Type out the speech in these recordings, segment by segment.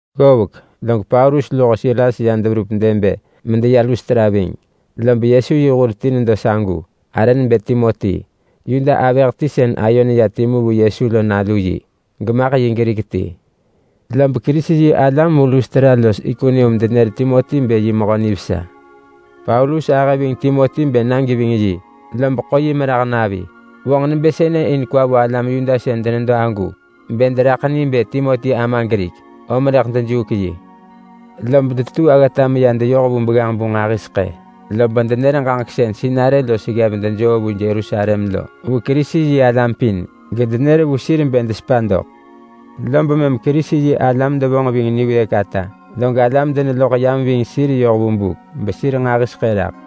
Ggovek log Paulus luho Silas ya deverup Derbe medeya Lustra ving. Lob Yesu yi hur ti nedo sagu arë nebë Timoti. Yuda avëh ti sën ayo neya timu vu Yesu lo nalu yi, gamaḳ Grik ti. Lob Kerisi-yi-alam vu Lustra los Ikonium denenër Timoti bë mehö nivesa. Paulus ahë ving Timoti bë na geving yi, lob ḳo yi merah navi. In kwa vo bë alam Yuda sën denedo agu, lob vonġ nebë sënë in deraḳ ni bë Timoti ama Grik, om rëḳ dejuuk yi. Lob detetuu aggata medeya deyoh vu begganġ-bu nġahiseḳë, lob denevonġ ġaġek sën sinarë los ggev dejoo vu Yerusalem lo vu Kerisi-yi-alam pin gedenër vu sir bë desepa doḳ. Lob mëm Kerisi-yi-alam devonġ ving niwëëk ata, log alam deneloḳ yam ving sir yoh vu buk, besir nġahiseḳë neraḳ.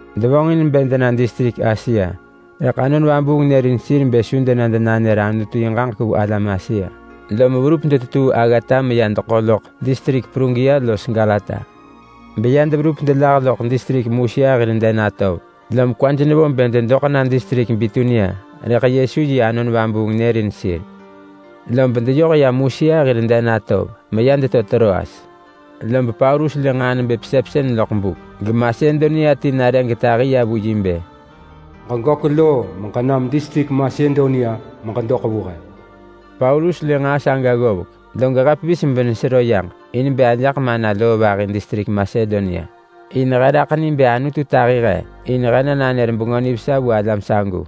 Devonġin bë dena distrik Asia rëḳ Anon Vabuung nërin sir bë su dena denanër Anutu yi ġaġek vu alam Asia. Lom verup detetuu aggata meya deḳo loḳ distrik Prugia los Galata. Lob ya deverup loḳ distrik Musia hir den atov, lom kwaj nevo bë dedoḳ na distrik Bitunia, rëḳ Yesu yi Anon Vabuung nërin sir. Lob deyoh ya Musia hir den atov meya deto Troas. Lob Paulus lë nġaa nebë pesepsën loḳ buk, geMasedonia ti nare getahi ya vu yi bë, “Ġeġök loo meġenam distrik Masedonia meġedoḳ vu he!” Paulus lë nġaa saga ggovek, log he pevis benesero yaġ in bë ajaḳ mana loo vahi distrik Masedonia, in he raḳ ni bë Anutu tahi he in bë he na nanër Bengö Nivesa vu alam sagu.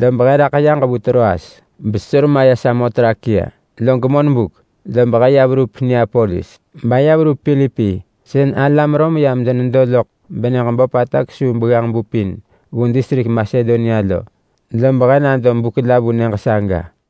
Lob he raḳ yaġ vu Troas besesor maya Samotrakia. Log monbuk lob he ya verup Neapolis, baya verup Pilipi sën alam Rom yam denedo loḳ benyëġ böpata kesuu begganġ-bu pin vu distrik Masedonia lo. Lob he nado buk la vu nyëġ saga.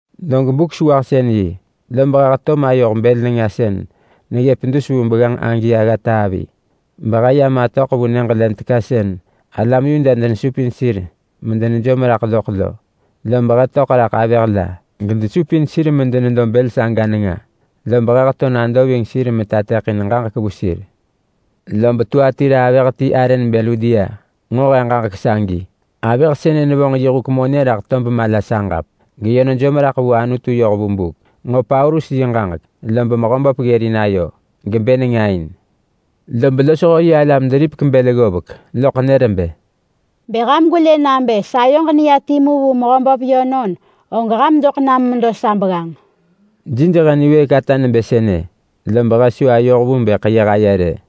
Log Buk-sewahsën-yi lob he heto mayoh bël nenga sën neggëp dus vu begganġ agi aggata avi, behe ya matöḳ vu nyëġ len teka sën alam Yuda denesupin sir medenejom raḳ loḳ lo. Lob he töḳ raḳ avëh la gedesupin sir medenedo bël saga nenga, lob he heto nado ving sir manër ġaġek ranġah vu sir. Lob Tuatira avëh ti arë nebë Ludia nġo he ġaġek sagi. Avëh sënë nevonġ huk monë yi raḳ tob mala saġap, geyö nejom raḳ vu Anutu yoh vu buk. Nenġo Paulus yi ġaġek lob Mehöböp ggërin ayo gebë nenga in. Lob losho yi alam deripek bël ggovek loḳ nër bë, “Bë ham gwelë nabë sayoġ neya timu vu Mehöböp yönon, og ham doḳ nam medo sa begganġ.” Jij he niwëëk ata nebë sënë, lob he su ayoh vu bë ḳeyëh aye rë.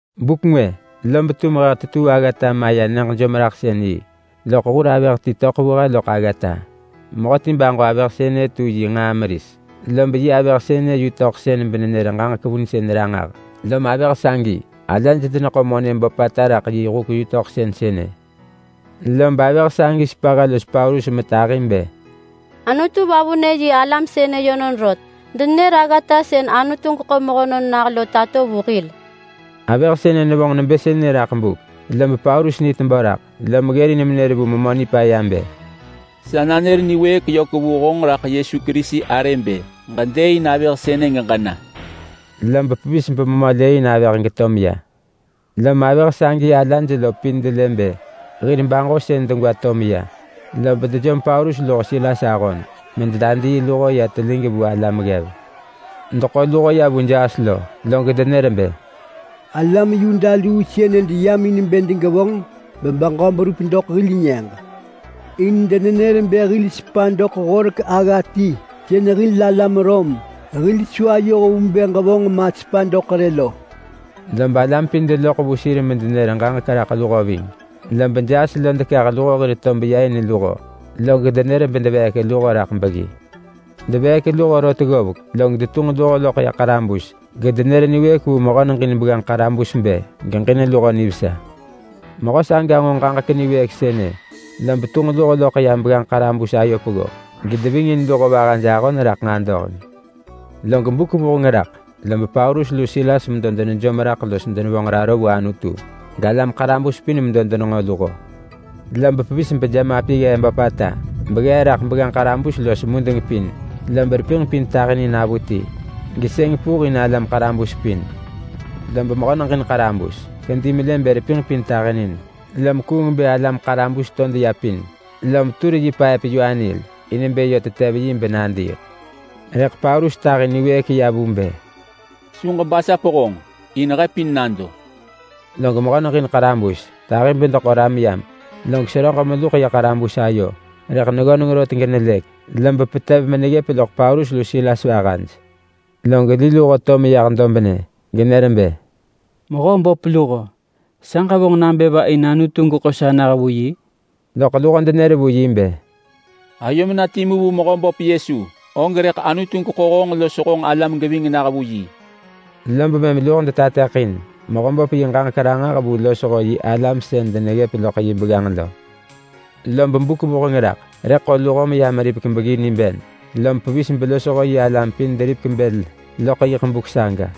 Buk ngwë lob tum he tetuu aggata maya nyëġ jomraḳsën-yi, loḳ hur avëh ti töḳ vu he loḳ aggata. Mehöti baġo avëh sënë tu yi nġaa meris, lob yi avëh sënë yutöḳsën benenër ġaġek vunsën ranġah. Lom avëh sagi ala neḳo monë böpata raḳ yi huk yutöḳsën sënë. Lob avëh sagi sepa he los Paulus metahi bë, “Anutu vavunë yi alam sënë yönon rot! Denenër aggata sën Anutu geḳo mehönon nah lo tato vu hil!” Avëh sënë nevonġ nebë sënë raḳ buk, lob Paulus ni tebö raḳ, lom ggërin menër vu memö nipaya bë, “Senër raḳ Yesu Kerisi arë niwëëk vu honġ bë ġedëëin avëh sënë geġena!” Lob pevis bememö lëëin avëh geto meya. Lom avëh sagi ala lo pin delë bë hir baġosën degwa to meya, lob dejom Paulus luho Silas ahon mededadii luho ya telig vu alam ggev. Deḳo luho ya vu kiap log denër bë, “Alam Yuda luu sënë deyam in bë degevonġ bebeġö berup doḳ hil nyëġ. In denenër bë hil sepa doḳ horek agga ti sën hil alam Rom hil su ayoh vu bë ġevonġ ma sepa doḳ rë lo.” Lob alam pin deloḳ vu sir medenër ġaġek raḳ luho ving. Lob kiap kah luho hir tob ya in luho, log nër bedeveek luho raḳ beggi. Deveek luho rot ggovek, log detunġ luho loḳ ya ḳarabus gedenër niwëëk vu mehö neġin begganġ ḳarabus bë geġin luho nivesa. Mehö saga nġo ġaġek niwëëk sënë, lob tunġ luho loḳ ya begganġ ḳarabus ayo peggo, gedevingin luho vahaj ahon raḳ nġadoheng. Log buk vuheng raḳ lob Paulus lu Silas medo denejom raḳ los denevonġ raro vu Anutu, galam ḳarabus pin medo denenġo luho. Lob pevis bejemapi ggee böpata beggee raḳ begganġ ḳarabus los mudeng pin, lob repinġ pin tahinin avuti, gesëng puh in alam ḳarabus pin. Lob mehö neġin ḳarabus kedi melë bë repinġ pin tahinin, lom kuung bë alam ḳarabus to deya pin, lom tur yi paëp-yu-anil in bë yö tetev yi benadiiḳ. Rëḳ Paulus tahi niwëëk ya vu bë, “Su ġebasap honġ! In he pin nado!” Log mehö neġin ḳarabus tahi bedeḳo ram yam. Log seröġ meluḳ ya ḳarabus ayo, rëḳ neggöneng rot genelëk, lob petev meneggëp loḳ Paulus lu Silas vahaj. Log li luho to meyah dobnë genër bë, “Mehö böp luho! Sa ġevonġ nabë va in Anutu geḳo sa nah vu yi?” Lob luho denër vu yi bë, “Ayom na timu vu Mehöböp Yesu, og rëḳ Anutu geḳo honġ los honġ alam geving nah vu yi.” Lob mëm luho detateḳin Mehöböp yi ġaġek ranġah vu losho yi alam sën deneggëp loḳ yi begganġ lo. Lob buk vuheng raḳ rëḳ ḳo luho beya meripek beggi niben. Lom pevis belosho yi alam pin deripek bël loḳ yiḳ buk saga.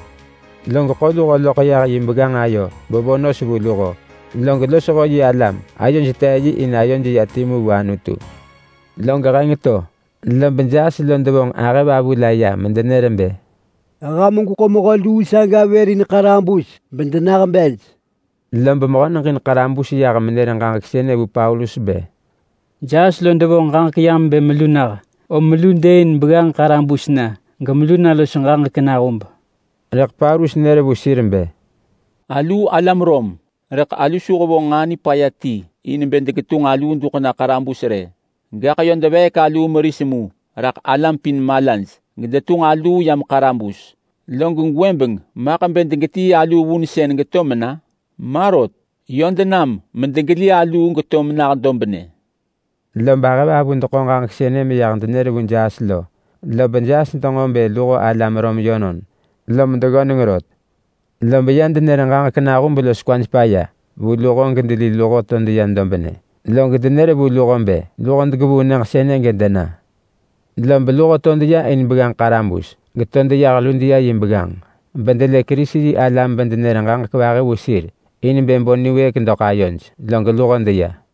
Log ḳo luho loḳ yah yi begganġ ayo bevo nos vu luho, log losho yi alam ayoj tee yi in ayoj ya timu vu Anutu. Log heng to, lob kiap devonġ ahëvavu la ya medenër bë, “Ham gweḳo mehö luu saga vër in ḳarabus bedenah bej!” Lob mehö neġin ḳarabus yah menër ġaġek sënë vu Paulus bë, “Kiap devonġ ġaġek yam bë melu nah. Om melu dëëin begganġ ḳarabus na gemelu na los ġaġek nahub.” Rëḳ Paulus nër vu sir bë, “Aluu alam Rom, rëḳ alu su hevonġ nġaa nipaya ti in bë degetunġ aluu duḳ na ḳarabus rë. Gaḳ yö desis aluu meris mu raḳ alam pin malaj gedetunġ aluu yam ḳarabus. Log gwëbeng maḳ bë degetii aluu vunsën geto mena? Ma rot! Yö denam medegeli aluu geto menah dobnë.” Lob ahëvavu deḳo ġaġek sënë meyah denër vu kiap lo, lob kiap denġo bë luho alam Rom yönon, lom deggöneng rot. Lob ya denër ġaġek nahub los kwaj paya vu luho gedeli luho to deyah dobnë. Log denër vu luho bë luho degevuu nyëġ sënë gedena. Lob luho to deya in begganġ ḳarabus, geto deyah Ludia yi begganġ, bedelë Kerisi-yi-alam bedenër ġaġek vahi vu sir in bë bo niwëëk doḳ ayoj. Log luho deya.